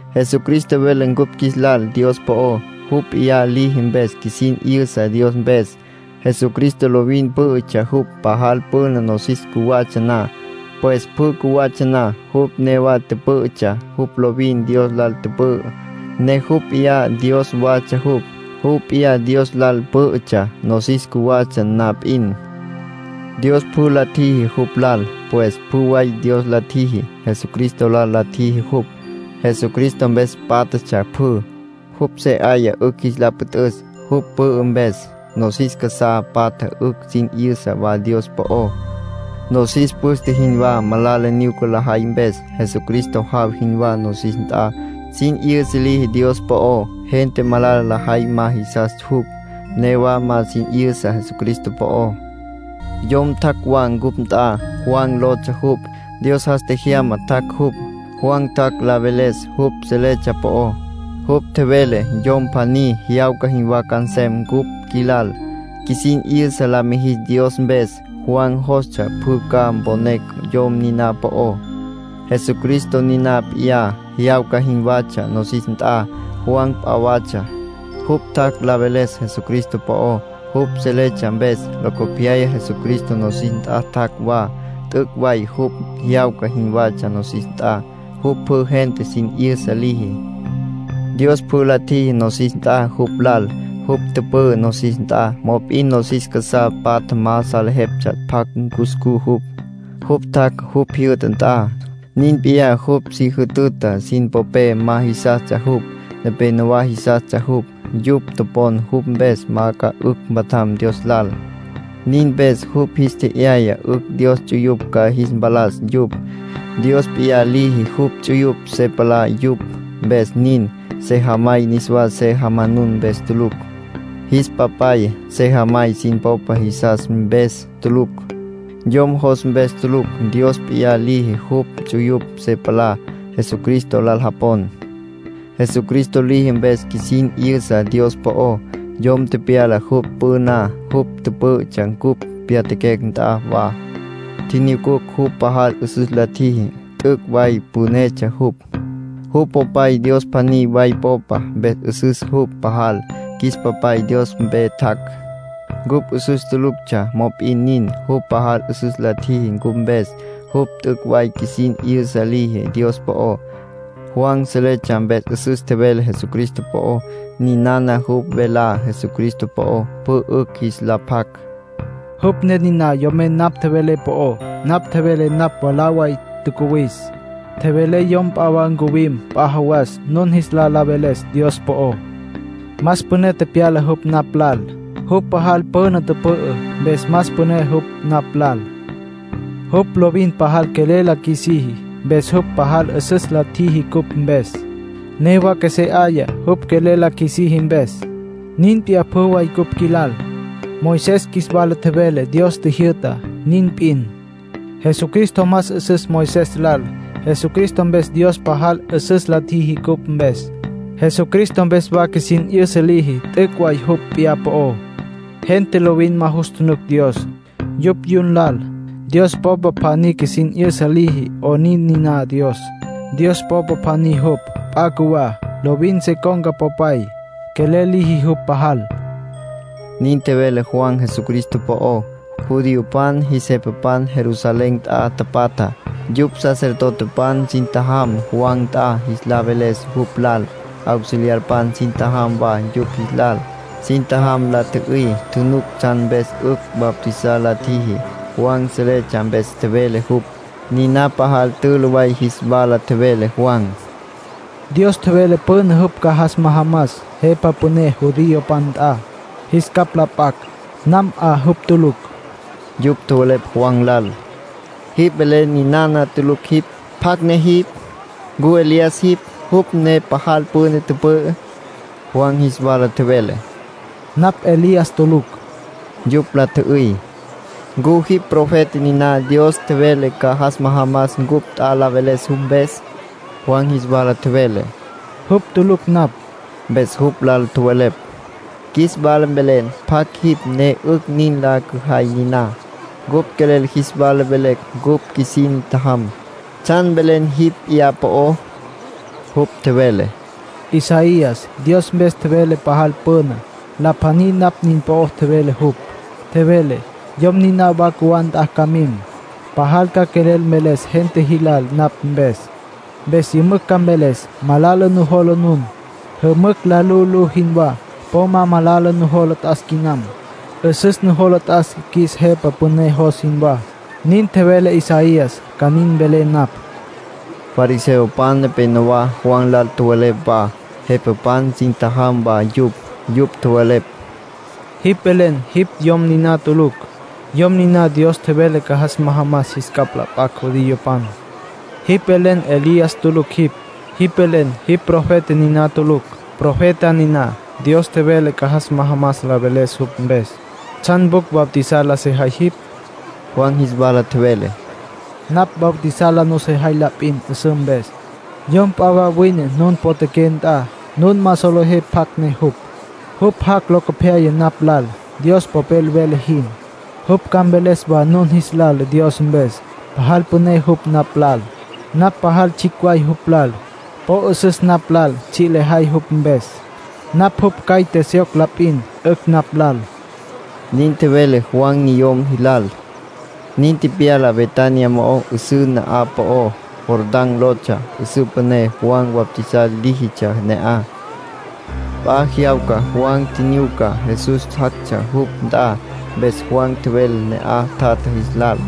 Jesucristo vele cupj qjuis lal Dios po'ó. Jupj p'iyá liji mpes qjuisin 'yüsa Dios mpes. Jesucristo lovin pǘ'ütsja jupj. Pajal püna nosis cjuwatsja na, pues pjü cjuwatsja na, jupj newa tüpǘ'ütsja. Jupj lovin Dios lal tüpü'ü, ne jupj p'iyá Dios watsja jupj. Jupj p'iyá Dios lal pǘ'ütsja nosis cjuwatsja na p'in. Dios pjü la tjiji jupj lal. Pues pjü way Dios la tjiji, Jesucristo lal la tjiji jupj. Jesucristo mpes pátjatsja pjü. Jupj se 'aya 'ücj jis la püt'üs. Jupj pü'ü mpes, nosis casá patja 'ücj sin 'yüsa wa Dios po'ó. Nosis püste jinwá malala nyuca lajay mpes. Jesucristo jaw jinwá nosis nt'a. Sin 'yüsa liji Dios po'ó. Gente malala lajay ma jisas jupj. Newa ma sin 'yüsa Jesucristo po'ó. Yom tjac' wa cupj nt'a. Juan lotsja jupj. Dios jas tjejyama tjac' jupj. Juan tjac' la veles jupj seletsja po'ó. Jupj tjevele yom pjaní jyawca jinwá ca nsem cupj qjuilal, qjuisin 'yüsa la mijis Dios mpes. Juan jostsja pjü ca mponecj yom niná po'ó. Jesucristo niná p'iyá, jyawca jinwatsja nosis nt'a. Juan p'a watsja. Jupj tjac' la veles Jesucristo po'ó, jupj seletsja mpes. Locopyaya Jesucristo nosis nt'a tjac' wa. T'üc' way jupj jyawca jinwatsja nosis nt'a. Jupj pjü gente sin 'yüsa liji. Dios pjü la tjiji nosis nt'a jupj lal. Jupj tüpü'ü nosis nt'a, mop'in nosis casá patja ma salejeptsja pjacj cuscú jupj. Jupj tjac' jupj jyü'ta nt'a; nin p'iyá jupj si jütüta sin popé ma jisastsja jupj. Nepénowa jisastsja jupj. Yupj topon jupj mpes ca 'ücj mpatjam Dios lal. Nin mpes jupj jis tje'yaya 'ücj Dios ts'uyupj ca jis mpalas yupj. Dios p'iyá liji jupj ts'uyupj se palá yupj, mpes nin. Sejamay niswa se jamanun mpes tulucj. Jis papay, sejamay sin popa jisas mpes tulucj. Yom jos mpes tulucj; Dios p'iyá liji jupj ts'uyupj se palá Jesucristo lal japon. Jesucristo liji mpes qjuisin 'yüsa Dios po'ó. Yom tepyala jupj püná. Jupj pǘ'ütsja ncupj pyatjaquecj nt'a wa. Tjinyucucj jupj pajal 'üsüs la tjiji, t'üc' way pünetsja jupj. Jupj Popay Dios pjaní way Popa, mpes 'üsüs jupj pajal. Qjuis Papay Dios mpe tjac'. Cupj 'üsüs tuluctsja, mop'in nin, jupj pajal 'üsüs la tjiji cupj mpes. Jupj t'üc' way qjuisin 'yüsa liji Dios po'ó. Juan seletsja mpes 'üsüs tjevele Jesucristo po'ó. Ninana jupj velá Jesucristo po'ó, pjü 'ücj jis la pjac: “Jupj ne niná yomen napj tjevelé po'ó. Napj tjevelé napj mwalá way tjacuwis; tjevelé yom p'a wa ncuwim p'a jawas nun jis lal la veles Dios po'ó. Más püné tepyala jupj napj lal. Jupj pajal püna tüpü'ü, mpes más püné jupj napj lal. ”Jupj lovin pajal quelel la qjuisiji. Mpes jupj pajal 'üsüs la tjiji cupj mpes. Newa qjuesé 'aya, jupj quelel la qjuisiji mpes. Nin p'iyá pjü way ncupj qjuilal. Moisés qjuis wala tjevele Dios tjijyü'tá, nin p'in. Jesucristo más 'üsüs Moisés lal. Jesucristo mpes Dios pajal 'üsüs la tjiji cupj mpes. Jesucristo mpes wa qjuisin 'yüsa liji t'üc' way jupj p'iyá po'ó. Gente lovin ma jus tjunuc Dios, yupj yun lal. Dios Popa pjaní qjuisin 'yüsa liji 'onin niná Dios. Dios Popa pjaní jupj, p'a cjuwá. Lovin se con̈ca Popay. Quelel liji jupj pajal”, nin tjevele Juan Jesucristo po'ó. Judiopan jis jepapan Jerusalén nt'a tapatja. Yupj sacerdotepan sin tjajam Juan nt'a jis la veles jupj lal. Auxiliarpan sin tjajam wa yupj jis lal. Sin tjajam la tjü'üy, tjunuc tsjan mpes 'ücj bautizar la tjiji. Juan seletsja mpes tjevele jupj. Niná pajal tülü way jis wala tjevele Juan: —Dios tjevele püná jupj ca jas majamas Jepa Püné judiopan nt'a, jis capj la p'acj. Nam 'a jupj tulucj. Yupj tjowelepj Juan lal: —Jipj velen ninana tulucj jipj. ¿Pjacj ne jipj? ¿Ncu Elías jipj, jupj ne pajal püna tüpü'ü? Juan jis wala tjevele: —Napj Elías tulucj. Yupj la tjü'üy: —¿Ncu jipj profeta niná Dios tjevele ca jas majamas cupj nt'a la veles jupj mpes? Juan jis wala tjevele: —Jupj tulucj napj. Mpes jupj lal tjowelepj: —Qjuis wala mvelen pjacj jipj ne 'ücj nin la cüjay niná. Cupj quelel jis wala velecj ncupj qjuisin tjajam. ¿Tsjan velen jipj p'iyá po'ó? Jupj tjevele: —Isaías Dios mpes tjevele pajal püna. La pjaní napj nin po'ó tjevele jupj. Tjevele: ‘Yom niná wa cjuwá nt'a ca mim. Pajal ca quelel mveles gente jilal napj mpes. Mpes yümücj ca mveles: “Malala nujola nun, jümücj la lu'ulú jinwá. Po ma malala nujola t'as quinam. 'Üsüs nujola t'as qjuis Jepa Püné jos jinwá.” ’ Nin tjevele Isaías ca nin mvelé napj —tjevele Juan. Fariseopan nepenowá Juan lal tjowelepj wa. Jepapan sin tjajam wa yupj. Yupj tjowelepj: —Jipj velen jipj Yom niná tulucj, Yom niná Dios tjevele ca jas majamas jis capj la p'acj judiopan. Jipj velen Elías tulucj jipj. Jipj velen jipj profeta niná tulucj, profeta niná Dios tjevele ca jas majamas la veles jupj mpes. ¿Tsjan pjucj bautizar la sejay jipj? Juan jis wala tjevele: —Napj bautizar la nusejay la p'in 'üsǘ mpes. Yom p'a wa wine nun potjaqué nt'a, nun ma solejé pjacj ne jupj. Jupj jac' locopyaya napj lal, Dios Popel vele jin. Jupj ca mveles wa nun jis lal Dios mpes. Pajal püné jupj napj lal. Napj pajal tsjicj way jupj lal. Po 'üsüs napj lal tsji' lejay jupj mpes. Napj jupj caite syoc la p'in, 'ücj napj lal —nin tjevele Juan niyom jilal. Nin tepyala Betania mo'ó 'üsǘ na'aj po'ó. Jordán lotsja 'üsǘ püné. Juan bautizar líjitsja ne'aj. P'a jyawca Juan tjinyuca Jesús jactsja jupj nt'a. Mpes Juan tjevele ne'aj tjatja jis lal: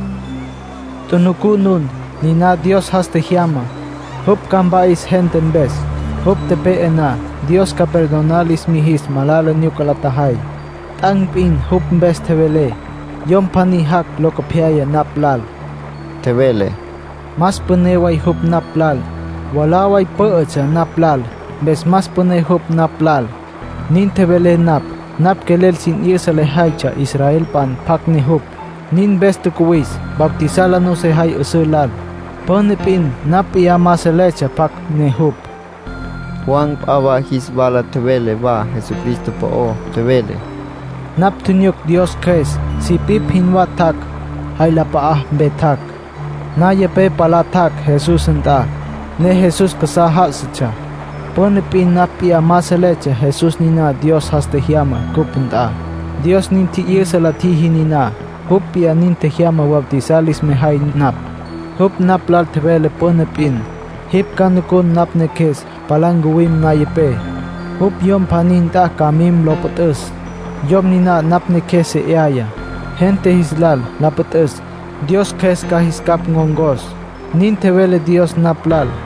“¡Tjunucú nun! Niná Dios jas tjejyama. Jupj ca mpa'is gente mpes. Jupj tepe'e na, Dios ca perdonar lis mijis malala nyuca la tjajay. T'an̈ p'in jupj mpes tjevelé. ‘Yom pjaní jac' locopyaya napj lal —tjevelé—. Más püné way jupj napj lal. Mwalá way pǘ'ütsja napj lal, mpes más püné jupj napj lal’, nin tjevelé napj. Napj quelel sin 'yüsa lejaytsja israelpan pjacj ne jupj. Nin mpes tjacuwis, bautizar la sejay 'üsǘ lal. Püna p'in napj p'iyá ma seletsja pjacj ne jupj”, tjevele Juan. Juan p'a wa jis wala tjevele wa Jesucristo po'ó. Tjevele: “Napj tjinyuc Dios Cjües sipipj jinwá tjac', jay la p'a'ape tjac'. Nayapé palá tjac' Jesús nt'a, ne Jesús casá já'asatsja. Püna p'in napj p'iyá ma seletsja Jesús niná Dios jas tjejyama cupj nt'a. Dios nin tji'yüsa la tjiji niná. Jupj p'iyá nin tjejyama bautizar lis mejay napj. Jupj napj lal tjevele püna p'in: ‘Jipj ca nucun napj Neqjues palá ncuwim nayapé. Jupj yom pjaní nt'a ca mim lo püt'üs. Yom niná napj Neqjues se 'aya, gente jis lal la püt'üs, Dios Cjües ca jis capj ncon̈cos’, nin tjevele Dios napj lal.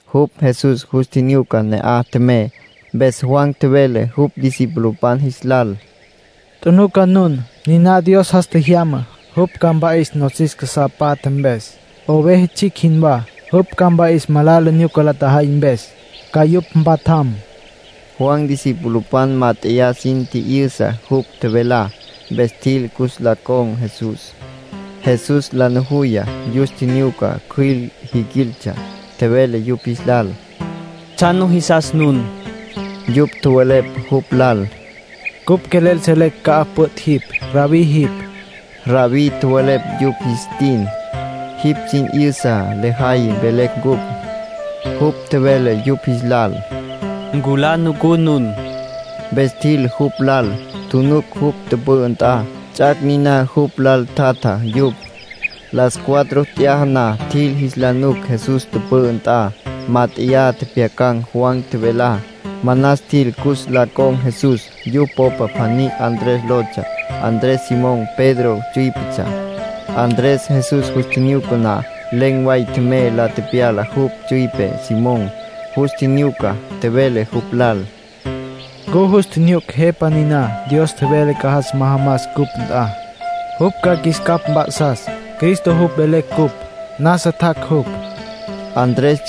Jupj Jesús jus tjinyuca ne'aj tjemey. Mpes Juan tjevele jupj discipulopan jis lal: —Tjunuca nun. Niná Dios jas tjejyamá. Jupj ca mpa'is nosis casá patja mpes, oveja tsjicj jinwá. Jupj ca mpa'is malala nyuca la tjajay mpes, ca yupj mpatjam. Juan discipulopan mát'eya sin tji'yüsa jupj tjevelá, mpes tjil cus la con̈ Jesús. Jesús la nujuya, yus tjinyuca cjüil jiquiltsja. Tjevele yupj jis lal: —¿Tsjan nujisas nun? Yupj tjowelepj jupj lal: —Cupj quelel selecj ca'aj püt' jipj. Rabbí jipj. (Rabbí tjowelepj yupj jis tin; “jipj sin 'yüsa lejay”, velecj cupj.) Jupj tjevele yupj jis lal: —Nculá, nucú nun. Mpes tjil jupj lal. Tjunuc jupj tüpü'ü nt'a. Ts'ac' niná jupj lal tjatja yupj. Las cuatro t'yaja na tjil jis la nuc Jesús tüpü'ü nt'a. Mát'eya tjepjyacan̈ Juan tjevelá. Manas tjil cus la con̈ Jesús. Yupj popa pjaní Andrés lotsja. Andrés Simón Pedro tsüípetsja. Andrés Jesús jus tjinyuca na, len̈ way tjemey la tepyala jupj tsüipe Simón. Jus tjinyuca, tjevele jupj lal: —Ncupj jus tjinyucucj Jepa niná Dios tjevele ca jas majamas cupj nt'a. Jupj ca qjuis capj mp'a'sas. ‘Cristo’ jupj velecj cupj. Nasa tjac' jupj —tjevele Andrés.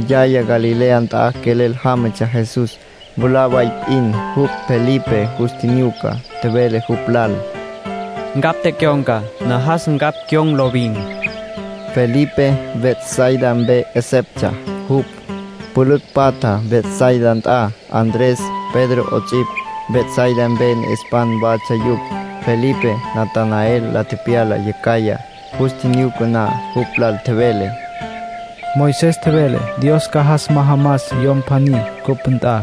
Yaya Galilea nt'a quelel jámatsja Jesús. Mwalá way p'in, jupj Felipe jus tjinyuca, tjevele jupj lal: —Ncapj tecyon̈ca. Najas ncapj cyon̈ lovin. Felipe Betsaida mpe 'eseptsja jupj. Pülücj patja Betsaida nt'a. Andrés, Pedro 'ots'ipj, Betsaida mpe ne'espan watsja yupj. Felipe Natanael la tepyala yacjaya. Jus tjinyuca na, jupj lal tjevele: —Moisés tjevele Dios ca jas majamas Yom pjaní cupj nt'a,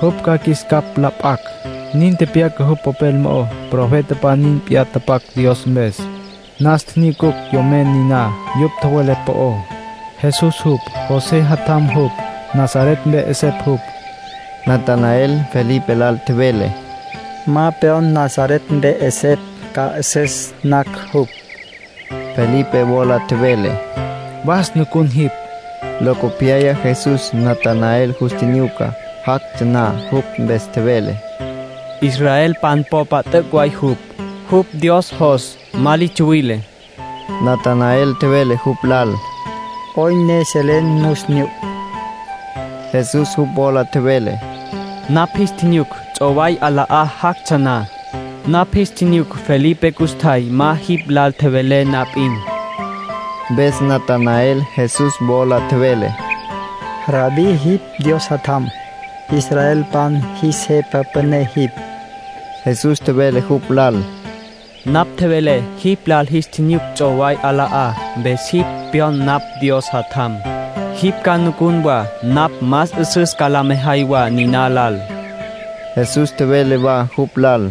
jupj ca qjuis capj la p'acj. Nin tepyaca jupj popel mo'ó. Profetapan nin p'iyá tapac Dios mpes. Nas tjinyucucj yomen niná yupj tjowelepj po'ó. Jesús jupj, José jatjam jupj. Nazaret mpe 'esepj jupj. Natanael Felipe lal tjevele: —Ma pyon Nazaret mpe 'esepj ca 'üsüs nacj jupj. Felipe wola tjevele: —Was, nucun jipj. Locopyaya Jesús Natanael jus tjinyuca, jactsja na. Jupj mpes tjevele: —Israelpan popa t'üc' way jupj. Jupj Dios jos. Ma li tsuwile. Natanael tjevele jupj lal: —¿'Oyn ne selen nus nyuc? Jesús jupj wola tjevele: —Napj jis tjinyuc, ts'oway 'ala'á jactsja na. Napj jis tjinyuc Felipe custjay ma jipj lal tjevele na p'in. Mpes Natanael Jesús wola tjevele: —Rabbí, jipj Dios Jatjam. Israelpan jis Jepa Püné jipj. Jesús tjevele jupj lal: —Napj tjevelé jipj lal jis tjinyuc ts'oway 'ala'á, mpes jipj pyon napj Dios Jatjam. Jipj ca nucun wa napj más 'üsüs ca la mejay wa niná lal. Jesús tjevele wa jupj lal: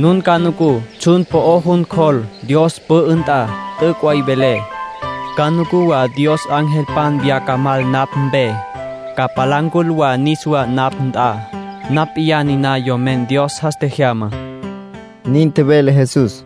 —Nun ca nucú tsjun po'ó jun cjol, Dios pü'ü nt'a. T'üc' way velé. Ca nucú wa Dios angelpan viyá ca mal napj mpe, ca palá ncul wa niswá napj nt'a. Napj p'iyá niná Yomen Dios jas tjejyama —nin tjevele Jesús.